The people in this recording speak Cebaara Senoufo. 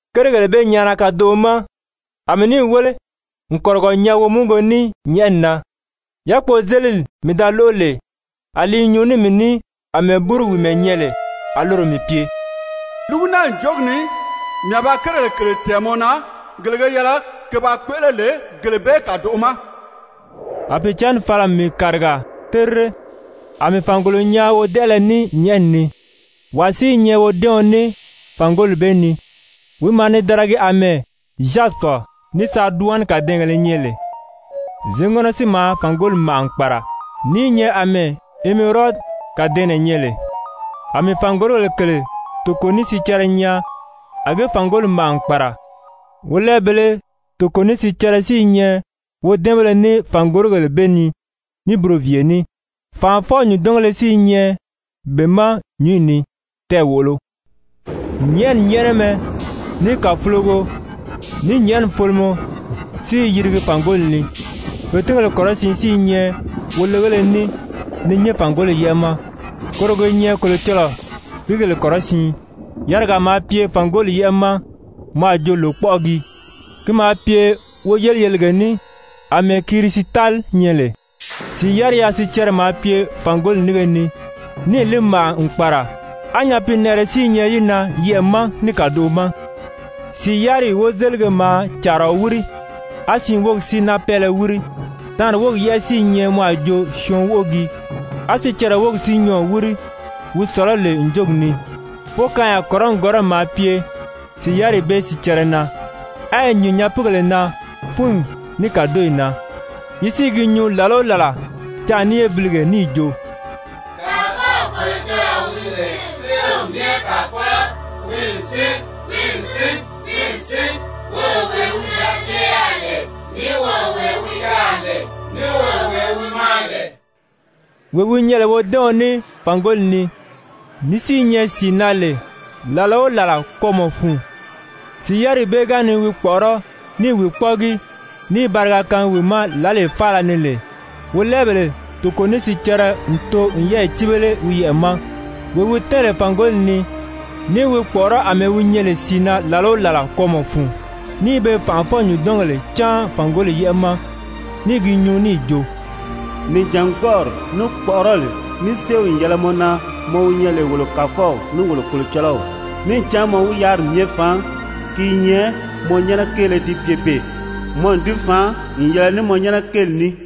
Kérigèle bee nyaana kadoʔo ma, a mii níì wéle n kɔ̀rigɔ nyaa womúgugo ní nyɛ̀ʔɛni na. Yákpozelili mii da lóʔo lè, a li i nyuu ní mii ní àmɛɛ búru wìimɛ nyɛ lè, a loro mii pye: «Lúgu naa ǹjogi ni mii a ba kérigèle kèle tɛ̀ɛn mɔ na gele ge yɛlɛ ke ba kpéʔele lè gele bee kàdoʔo ma.» A Pìicǎnni fala n mii kàriga terire. A mii fàngolo nyaa wodɛʔɛlɛ ní nyɛ̀ʔɛni ni, wàa si i nyɛ wodɛ́ɛɔn ní fàngoli bee ni. Wi maa ni daragi àmɛɛ Zyasipi ní Sariduwani kadɛɛngèlē nyɛ lè, zěŋɔnɔ si maa fàngoli màʔa n kpàra ní i nyɛ àmɛɛ emerodi kàdɛɛnnɛ nyɛ lè. A mii fàngorigèle kèle toko ní sicɛrɛ nyaa a ge fàngoli màʔa n kpàra, wolɛɛbèlē toko ní sicɛrɛ si i nyɛ wodɛ́ɛnbéle ní fàngorigèle bee ni ní buroviiye ní, fànʔafɔ-nyùndɔngéle si i nyɛ be ma nyúnyi ni, tɛɛ̀ wòʔolo. Nyɛ̀ʔɛni nyɛ́ʔɛnɛmɛ, ní kàfulogo, ní nyɛ̀ʔɛni folomɔ si i yirigi fàngoli ni. Fètingéle kɔrɔsiin si i nyɛ wolegéle ní ni nyín fàngoli yɛ́ʔɛ ma, koro ge nyɛ Kolocɔlɔɔ pìígèle kɔrɔsiin. Yarigaa maa pye fàngoli yɛ́ʔɛ ma mɔ a jo lòkpɔʔɔ gii, ki maa pye woyeliyelige ní àmɛɛ kirisitali Kirisitali: Kàdɛɛngèle féleye kàlawaga wéle. nyɛ lè. Sìi yáriya sicɛrɛ maa pye fàngoli nínge ni, níì li màʔa n kpàra, á nyapiinɛʔɛrɛ si i nyɛ yi na yɛʔɛ̀ ma ní kàdoʔo ma. Sìi yáriyi wozelige maa càaraɔ wíri, á siin wógi si náapɛɛlɛ wíri, taanri wógi yɛ́ʔɛ si i nyɛ mɔ a jo syɔɔn wóʔo gii, á sicɛrɛ wógi si nyɔɔ̀ wíri, wi sɔ̀lɔ́ lè ǹjogi ni. Fókaanya kɔrɔni kɔrɔni maa pye sìi yáriyi bee sicɛrɛ na, á yi nyìn nyapiigèle na fúnyi ní kàdoyi na. Yi si i gi nyuu làla o làla canʔa ní yébilige níì jo: «Kàfɔw Kolocɔlɔɔ wi lè Séew Myɛ Kàfɔlɔ, wi n sín, wi n sín, wi n sín, woro wee wi da pye yaà lè, ní woro wee wi yaà lè, ní woro wee wi maa lè.» Wee wi nyɛ lè wodɛ́ɛɔn ní fàngoli ni, ní si i nyɛ sìi na lè làla o làla kwɔ́ɔmɔ fun, sìi yáriyi bee ga ni wi kpɔ̀ʔɔrɔ́ ní i wi kpɔ́ʔɔgi, ní i bariga kaangi wi ma lǎlee faala ni lè, wolɛɛbèle toko ní sicɛrɛ n too n pe yɛ́ɛyi cíbele wi yɛʔɛ ma, wee wi tɛ́ɛn lè fàngoli ni, ní i wi kpɔ̀ʔɔrɔ́ àmɛɛ wi nyɛ lè sìi na làla o làla kwɔ́ɔmɔ fun, ní i pe fànʔafɔ-nyùndɔngèle cáan fàngoli yɛ́ʔɛ̀ ma, ní i gi nyuu níì jo: «Nìjangbɔɔri, ní kpɔ̀ʔɔrɔli, ní séew n yɛlɛ mɔ na, mɔ wi nyɛ lè wolo Kàfɔw ní wolo Kolocɔlɔw, níì cán mɔ wi yáriri myɛ faan, ki i nyɛ mɔ nyɛ́nɛ kéele di pye beè, mɔ n di faan n yɛlɛ ní mɔ nyɛ́nɛ kéeli ní.»